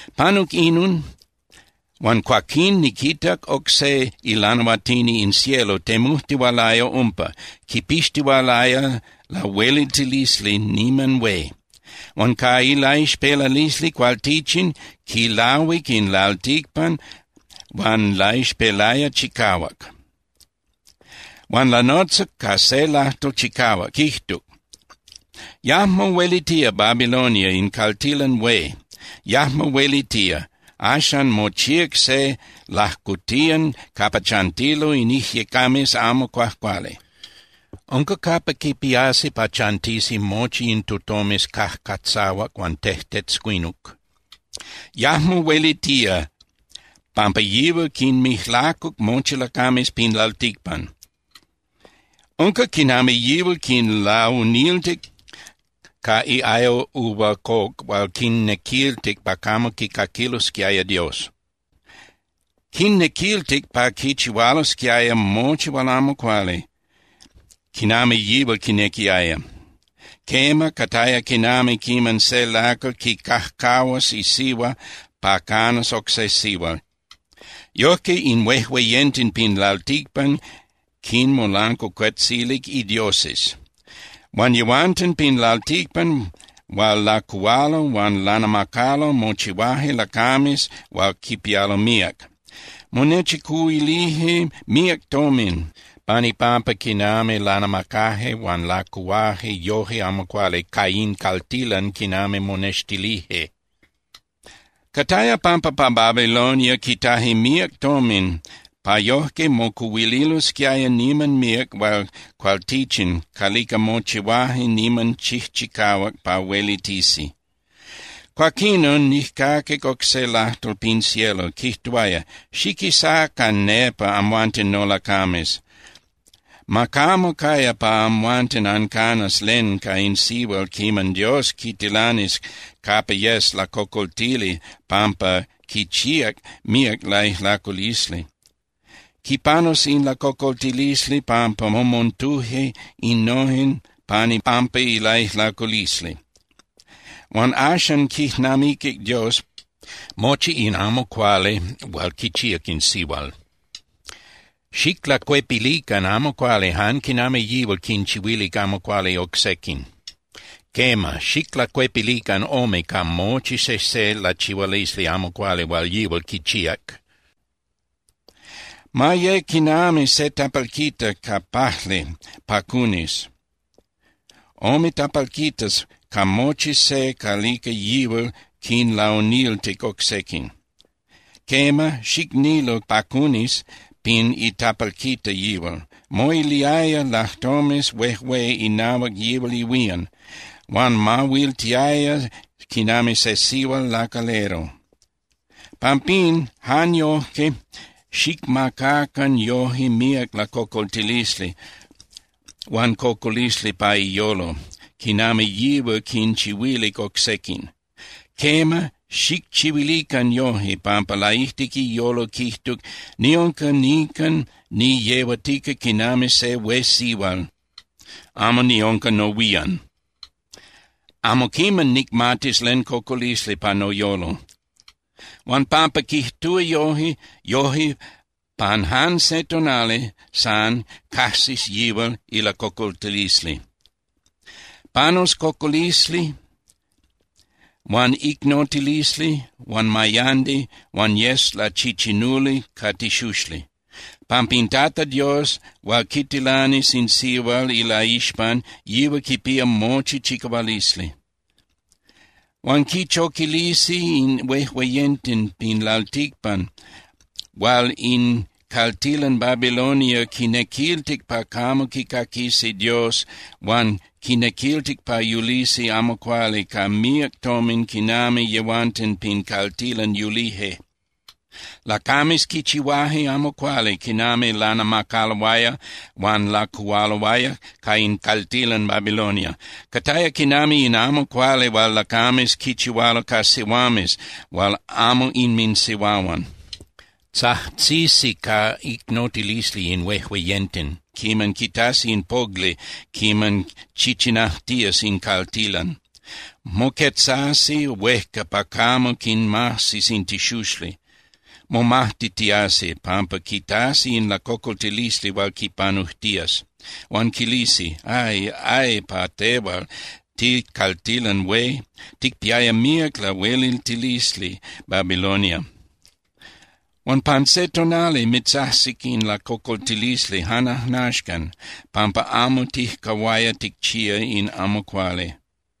Panuc inon huan cuaquín niquitac oc se ilanahuatini in cielo temujtihualaya umpa, quipixtihualaya lahueliltilisli niman hué. Huan ca ilaixpelalisli cualtichin quilahuic in lalticpan huan laixpelaya chicahuac. Huan lanotzac ca se lajtol chicahuac, quijtuc: —Yajmo huelitía Babilonia in caltilan hué, yajmo huelitía. Axan mochíac se lajcotiyan capa chantilo in ijyecames amo cuajcuali. Unca capa quipiasi pa chantisi mochi in tutomes cajcatzahuac huan tejtetzcuinuc. Yajmo huelitía pampa yihual quinmijlacuc mochi lacames pin lalticpan. Unca quinami yihual quinlauniltic ca iayo uva coc hual quinnequiltic pa camo quicaquilosquiaya Dios. Quinnequiltic pa quichihualosquiaya mochi hual amo cuali, quinami yihual quinequiaya. Quema, cataya quinami quiman se lacal quicajcahuas isihua pa canas oc se sihual, yojque in huejueyenten pin lalticpan quinmolancuacuetzilic idioses. Huan yehuanten pin lalticpan hual lacuhualo huan lanamacalo mochihuaje lacames hual quipialo míac. Monechicuhuilije míac tomin pan ipampa quinami lanamacaje huan lacuhuaje yoje amo cuali ca in caltilan quinami monextilije. Cataya pampa pa Babilonia quitaje míac tomin pa yojque mocuhuililosquiaya niman míac hual cualtichin calica mochihuaje niman chijchicahuac pa huelitisi. Cuaquinon nijcaquic oc se lajtol pin cielo, quijtuaya: —Xiquisacan nepa, amhuanten nolacames, ma camo caya pa amhuanten ancanas len ca in sihual quiman Dios quitilanis capa yes lacocoltili pampa quichíac míac laijlaculisli. Quipanus in lacocoltilisli pampa momontuje innojen pan ipampa ilaijlaculisli. Huan axan quijnamiquic Dios mochi in amo cuali hual quichíac in sihual. Xiclacuepilican amo cuali jan quinami yihual quinchihuilic amo cuali oc sequin. Quema, xiclacuepilican ome ca mochi sejse lachihualisli amo cuali hual yihual quichíac. Ma ye quinami se tapalquita ca pajli pa cunis, ome tapalquitas ca mochi se calica yihual quinlauniltic oc sequin. Quema, xicnilu pa cunis pin itapalquita yihual. Moiliaya lajtomes huejué inahuac yihual ihuían, huan mahuiltiaya quinami se sihual lacalero. Pampín, jan yojque xicmacacan yoje míac lacocoltilisli huan cocolisli pa iyolo, quinami yihual quinchihuilic oc sequin. Quema, xicchihuilican yojque, pampa laijtic iyolo quijtuc: “Niunca nican niyehuatica quinami se hué sihual, amo niunca nohuían. Amo quiman nicmatis len cocolisli pa noyolo.” Huan pampa quijtúa yoje, yoje pan jan se tonali san cajsis yihual ilacocoltilisli. Panus cocolisli huan icnotilisli huan mayandi, huan yes lachichinuli ca tixuxli, pampa in Tata Dios hual quitilanis in sihual ilaixpan yihual quipía mochi chicahualisli. Huan quichoquilisi in huejueyenten pin lalticpan hual in caltilan Babilonia quinnequiltic pa camo quicaquisi Dios huan quinnequiltic pa yulisi amo cuali ca míac tomin quinami yehuanten pin caltilan yulije. Lacames quichihuaje amo cuali quinami lanamacaloaya huan lacuhualoaya ca in caltilan Babilonia. Cataya quinami in amo cuali hual lacames quichihualo ca sihuames hual amo inminsihuahuan. Tzajtzisi ca icnotilisli in huejueyenten quiman quitasi in pogli quiman chichinajtías in caltilan. Moquetzasi huejca pa camo quinmajsis in tixuxli, momajtitiasi pampa quitasi in lacocoltilisli hual quipanujtías, huan quilisi: —¡Ay! ¡Ay pa tehual, ticaltilan hué, ticpiaya míac lahueliltilisli, Babilonia! ¡Huan pan se tonali mitzajsic in lacocoltilisli jan ajnaxcan pampa amo tijcahuaya ticchía in amo cuali!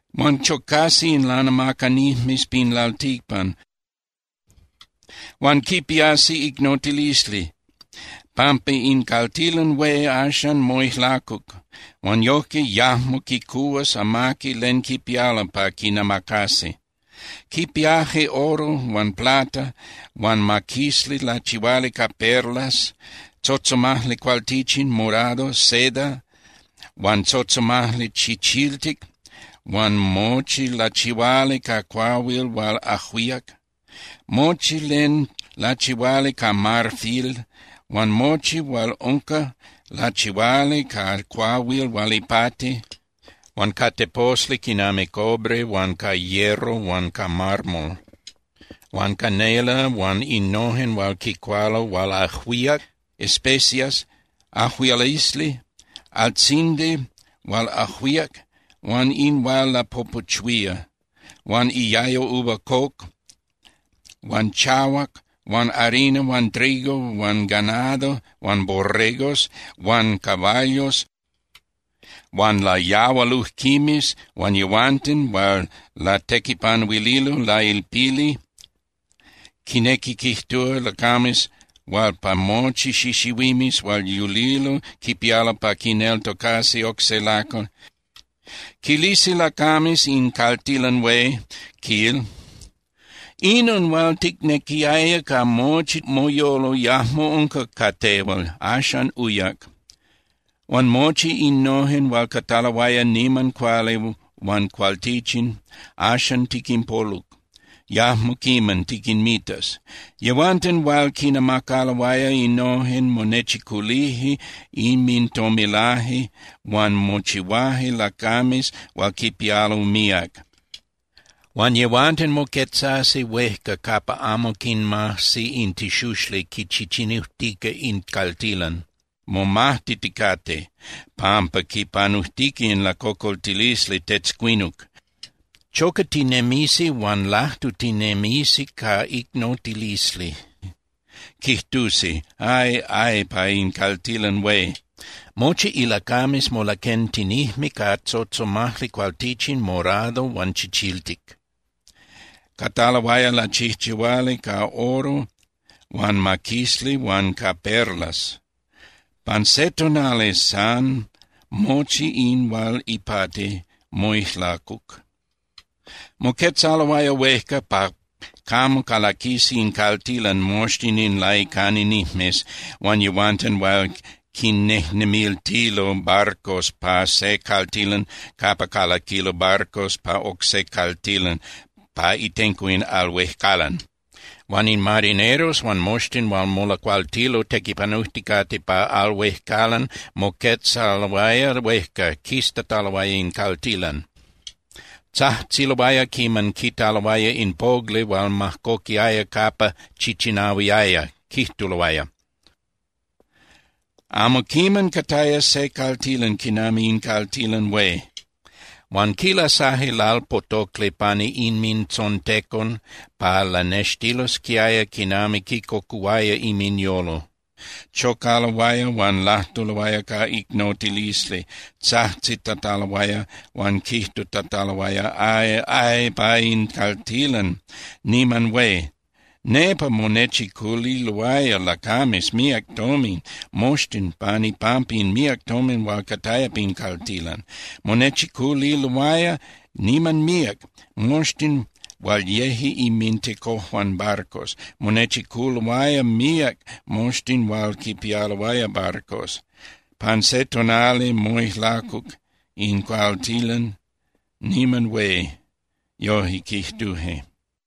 Huan chocasi in lanamacanijmes pin lalticpan, huan quipiasi icnotilisli pampa in caltilan hué axan moijlacuc huan yojque yajmo quicuhuas amaqui len quipialo pa quinamacasi. Quipiaje oro huan plata huan maquisli lachihuali ca perlas, tzotzomajli cualtichin, morado, seda, huan tzotzomajli chichiltic huan mochi lachihuali ca cuahuil hual ajuíac, mochi len lachihuali ca marfil huan mochi hual unca lachihuali ca cuahuil hual ipati, huan ca teposli quinami cobre huan ca hierro huan ca mármol, huan canela huan innojen hual quicualo hual ajuíac (especias), ajuialisli, altzindi hual ajuíac, huan in hual lapopuchuía, huan iayo uva coc huan chahuac huan harina huan trigo huan ganado huan borregos huan caballos huan layahualujquimes huan yehuanten hual latequipanuililo lailpili, quinequi quijtúa, lacames hual pa mochi xixihuimes hual yulilo quipialo pa quineltocasi oc se lacal. Quilisi lacames in caltilan hué, quil: —¡Inon hual ticnequiaya ca mochi moyolo yajmo unca ca tehual, axan uyac! ¡Huan mochi innojen hual cataloaya niman cuali huan cualtichin, axan tiquinpoluc, yajmo quiman tiquinmitas! Yehuanten hual quinnamacaloaya innojen monechiculije inmintomilaje huan mochihuaje lacames hual quipialo míac. Huan yehuanten moquetzasi huejca capa amo quinmajsi in tixuxli quichichinujtica in caltilan, momajtiticate pampa quipanujtica in lacocoltilisli tetzcuinuc, chocatinemisi huan lajtutinemisi ca icnotilisli. Quijtusi: —¡Ay, ay pa in caltilan hué! ¡Mochi ilacames molaquentinijme ca tzotzomajli cualtichin morado huan chichiltic, cataloaya lachijchihuali ca oro huan maquisli huan ca perlas! ¡Pan se tonali san mochi in hual ipati moijlacuc! Moquetzaloaya huejca pa camo calaquisi in caltilan moxtin in laicananijmes huan yehuanten hual quinnejnemiltilo barcos pa se caltilan capa calaquilo barcos pa oc se caltilan pa itenco in al huejcalan. Huan in marineros huan moxtin hual molacualtilo tequipanujticate pa al huejcalan moquetzaloaya huejca, quiztataloaya in caltilan. Tzajtziloaya quiman quitaloaya in pogli hual majcoquiaya capa chichinahuiaya, quijtuloaya: —Amo quiman cataya se caltilan quinami in caltilan hué. Huan quilasaje lalpotocli pani inmintzontecon pa lanextilosquiaya quinami quincocuhuaya inminyolo. Chocaloaya huan lajtuloaya ca icnotilisli, tzajtzitataloaya huan quijtutataloaya: —¡Ay, ay pa in caltilan niman hué! ¡Nepa monechiculiloaya lacames míac tomin moxtin pan ipampa in míac tomin hual cataya pin caltilan! Monechiculiloaya niman míac moxtin hual yeje inmintecojuan barcos. Monechiculoaya míac moxtin hual quinpialoaya barcos. ¡Pan se tonali moijlacuc in caltilan niman hué! Yojque quijtuje.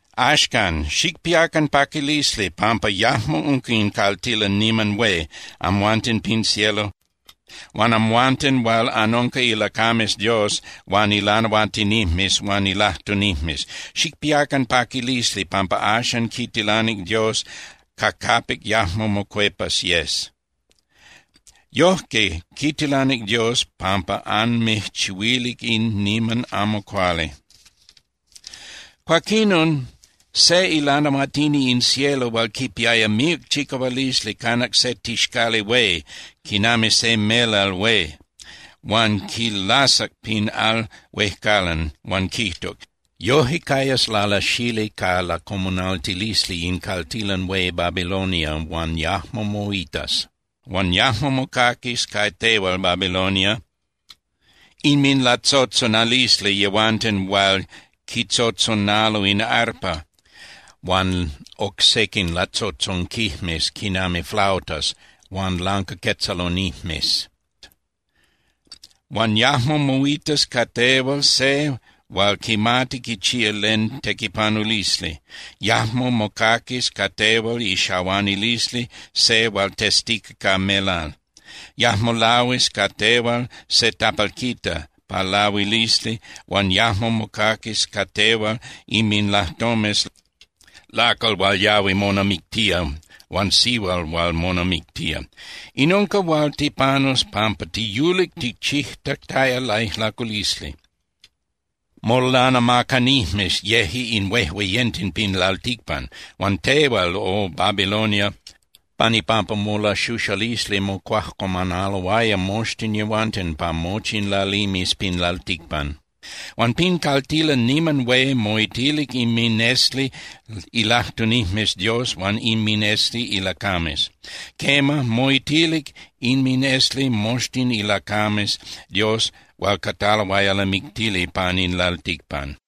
’Axcan, xicpiacan paquilisli pampa yajmo unca in caltilan niman hué, amhuanten pin cielo, huan amhuanten hual anunca ilacames Dios huan ilanahuatinijmes huan ilajtunijmes. Xicpiacan paquilisli pampa axan quitilanic Dios ca capic yajmo mocuepas yes. Yojque quitilanic Dios pampa anmijchihuilic in niman amo cuali. Cuaquinon se ilanahuatini in cielo hual quipiaya míac chicahualisli canac se tixcali hué quinami se melal hué huan quilasac pin al huejcalan, huan quijtuc: —Yoje cayas lalasali ca lacomunaltilisli in caltilan hué Babilonia huan yajmo moitas. Huan yajmo mocaquis ca tehual, Babilonia, inminlatzotzonalisli yehuanten hual quintzotzonalo in arpa, huan oc sequin latzotzonquijmes quinami flautas huan lancaquetzalonijmes. Huan yajmo moitas ca tehual se hual quimati quichía len tequipanulisli. Yajmo mocaquis ca tehual ixahuanilisli se hual testica ca melal. Yajmo lahuis ca tehual se tapalquita pa lahuilisli huan yajmo mocaquis ca tehual inminlajtomes lacal hual yahui monamictía huan sihual hual monamictía. In unca hual tipanus pampa tiyulic ticchijtataya laijlaculisli. Molanamacanijmes yeje in huejueyenten pin lalticpan. Huan tehual, O Babilonia, pan ipampa molaxuxalisli mocuajcuamanaloaya moxtin yehuanten pa mochi in lalimes pin lalticpan. Huan pin caltilan niman hué moitilic inminesli ilajtunijmes Dios huan inminesli ilacames. Quema, moitilic inminesli moxtin ilacames Dios hual cataloaya lamictili pan in lalticpan.